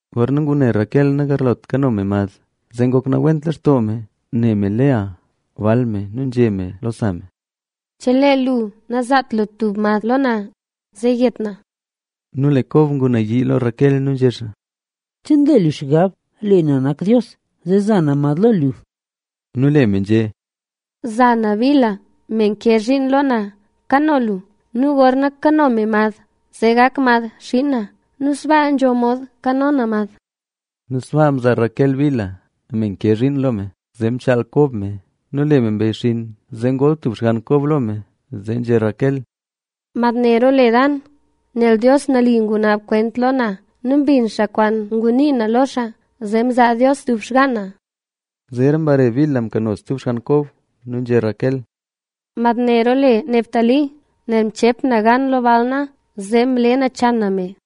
Gorna ngune Raquel nagarlot kano me mad, zee ngok nawent lextoo me ne me Lea, bal me. Nu nzhé me lo sa me: —¡Chelee lu nazaat lu tub mad lo na, zee yet na! Nu lee Kob ngunayii lo Raquel nu nzhé xaa: —¿Che nle lu xgab lee na nak Dios, zee za na mad lo lu? Nu lee me nzhé: —Za na Bilha, me nke zhiin lo na, kano lu nu gorna kano me mad, zee gak mad xiin na. Nu sbaa nzho mod kano na mad. Nu sbaa mzaa Raquel Bilha me nke zhiin lo me, zee mchaal Kob me. Nu lee me mbeyxinn, zee ngol tub xgann Kob lo me. Zee nzhé Raquel: —Mad ne roole Dan,a nel Dios nali ngunaab kwent lo na nu mbin xaa kwaan ngunii na lo xaa, zee mzaa Dios tub xgaan na. Zeera mbare Bilha mkano stub xgann Kob. Nu nzhé Raquel: —Mad ne roole Neftalí,b nel mcheep na gan lo bal na zee mle nachan na me.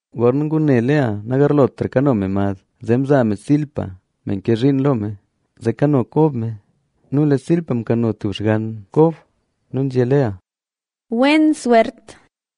Gorna ngune Lea nagarlotra kano me mad, zee mzaa me Zilpa, me mke zhiin lo me, zee kano Kob me. Nu lee Zilpa mkano tub xgann Kob. Nu nzhé Lea: —¡Wen swert!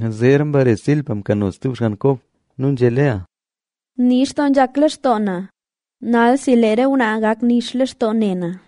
Zeera mbare Zilpa mkano stub xgann Kob. Nu nzhé Lea: —Nix doo nzhak lextoo na. Nalsi lee re ngwnaa gak nix lextoo ne na.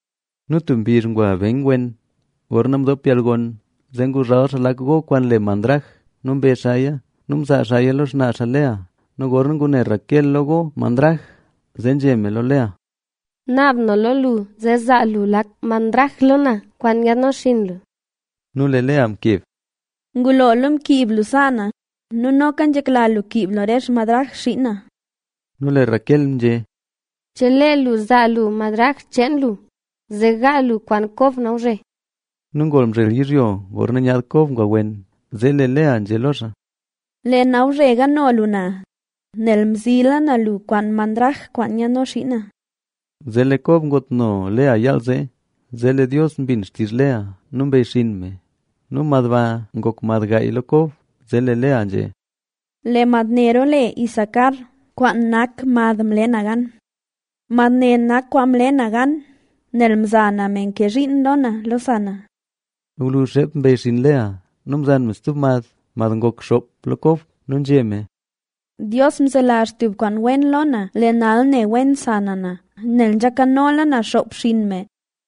Nu tub mbizh ngwa Ben wen, gorna mdoop yalgon, zee nguzhal xaa lak go kwaan le mandrage nu mbe xaaya nu mzaa xaaya lo xnaa xaa Lea. Nu gorna ngune Raquel lo go mandrag, zee nzhé me lo Lea: —Naab na lo lu zee zaa lu lak mandrag lo na, kwaan nyaadno xinn lu. Nu lee Lea mkeb: —¡Ngulola mkiib lu sa na nu noka nzhekla lu kiib lu re xmandrag xiin na! Nu lee Raquel nzhé: —Chelee lu zaa lu mandrag cheen lu, zee gaa lu kwaan Kob nawzhe. Nu ngol mzhel yizhyo gorna nyaad Kob ngwa wen, zee lee Lea nzhé lo xaa: —Lee nawzhe gaano lu na, nel mzila na lu kwaan mandrag kwaan nyaadno xiin na. Zee lee Kob ngootno Lea yaal zee. Zee lee Dios mbin xtizh Lea nu mbeyxinn me nu mad ba ngok mad gaay lo Kob. Zee lee Lea nzhé: —Lee mad ne roole Isacar,f kwaan nak mad mle na gan, nel nzhé me: “Mad ne nak kwaan mle na gan nel mza na me nke zhiin lo na lo sa na”. Gwluzh xeep mbeyxinn Lea nu mzan me stub mad, mad ngok xoop lo Kob. Nu nzhé me: —¡Dios mzelazh tub kwaan wen lo na! Lee nal ne wen sa na na, nel nzha nkanola na xoop xinn me.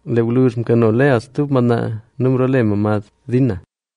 Lee gwluzh mkano Lea stub madnaa mloole me mad Dina.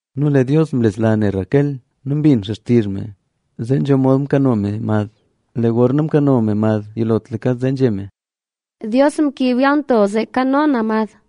Nu lee Dios mlesla ne Raquel nu mbin xaa xtizh me zee nzho mod mkano me mad. Lee gorna mkano me mad yilotlaka, zee nzhé me: —Dios mkiib yalnto zee nkano na mad.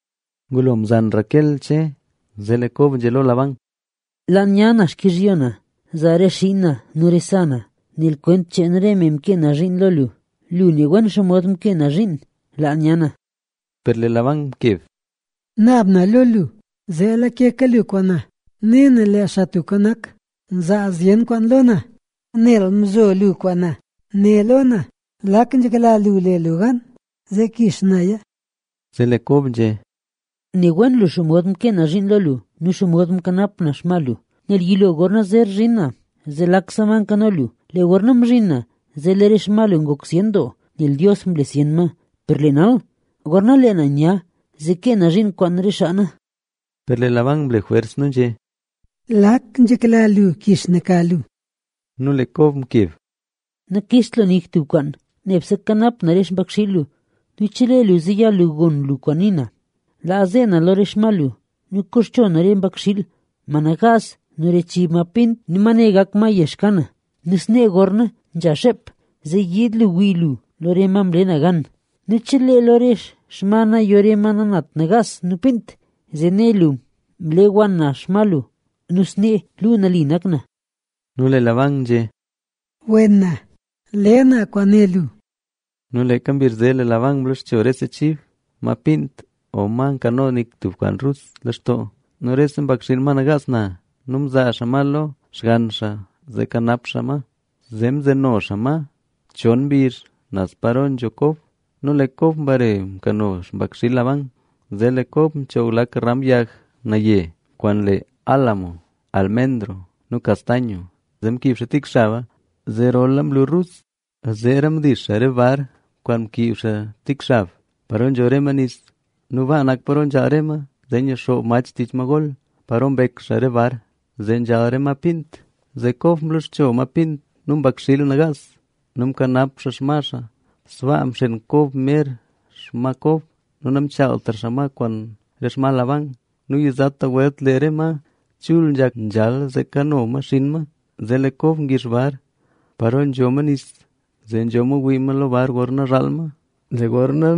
Ngulo mzan Raquel Che, zee lee Kob nzhé lo Labán: —Laa nya na xkizhyo na. Zaa re xiin na nu re sa na, nel kwent cheen re me mkee na zhiin lo lu. Lu ne wen xomod mkee na zhiin. Laa nya na. Per lee Labán mkeb: —Naab na lo lu zee lakeka lu kwaan na. Ne na lee Xaa Tubka Nak mzaa zyen kwaan lo na, nel mzo lu kwaan na. Né lo na lak nzhekla lu le lu gan, zee kix naya. Zee lee Kob nzhé: —Ne wen lu xomod mkee na zhiin lo lu nu xomod mkanap na xma lu. Nel yilo gorna zer zhin na zee lakse ma mkano lu, lee gorna mzhin na zee lee re xma lu ngok zyen doo, nel Dios mle zyen ma. Per lee nal, gorna lee na nya zee kee na zhiin kwaan re xaa na. Per lee Labán mle jwers nu nzhé: —¿Lak nzhekla lu kix na ka lu? Nu lee Kob mkeb: —Nakixt lu nik tub kwaan, nebse kanap na re xpakxiil lu nu chelee lu zeyal lu gon lu kwaan nii na, laa ze na lo re xma lu nu koxcho na re mbakxiil, ma nagaas nu re chib ma pint. Nu ma ne gak kwaan yex ka na. Nu snee gorna nzha xeep zee yiid lu wii lu lo re ma mle na gan. Nu chelee lo re xma na yo re ma nanat nagaas nu pint, zee ne lu mle wann na xma lu nu snee luu nali nak na. Nu lee Labán nzhé: —Wena. Le na kwaan né lu. Nu leeka mbizh zee Labán mloxcho rese chib, ma pint o ma nkano tik kwaan rus lextoo nu rese mbakxiil, ma nagaas na. Nu mzaa xaa ma lo xgann xaa zee kanap xaa ma. Zee mzeno xaa ma chon mbizh naz paro nzho Kob. Nu lee Kob mbare mkano xpakxiil Labán. Zee lee Kob mchoog lak ram yag naye kwaan le álamo, almendro nu castaño. Zee mkiib xaa tik xaba zee rola mlu rus. Zeera mdix xaa re bar kwaan mkiib xaa tik xab, paro nzho re ma nis. Nu baa nak paro nzhaal re ma zee nyixoob mach tich ma gol, paro mbek xaa re bar, zee nzhal re ma pint. Zee Kob mloxcho ma pint nu mbakxiil nagaas nu mkanap xaa xma xaa. Sbaa mxeen Kob mer xma Kob nu namchaaltra xaa ma kwaan re xma Labán. Nu yizata welt lee re ma chul nzhak nzhaal zee kano ma xinn ma, zee lee Kob ngix bar paro nzho ma nis, zee nzho mod wii ma lo bar gorna nzhaal ma. Lee gorna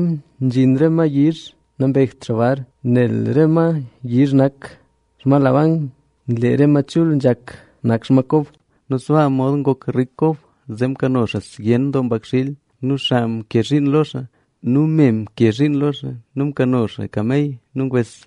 nzhin re ma yizh nambekt xaa bar, nel re ma yizh nak xma Labán. Lee re ma chul nzhak nak xma Kob. Sbaa mod ngok rik Kob, zee mkano xaa zyen doo mbakxiil nu xaa mke zhiin lo xaa nu me mke zhiin lo xaa nu mkano xaa kamey nu ngwes.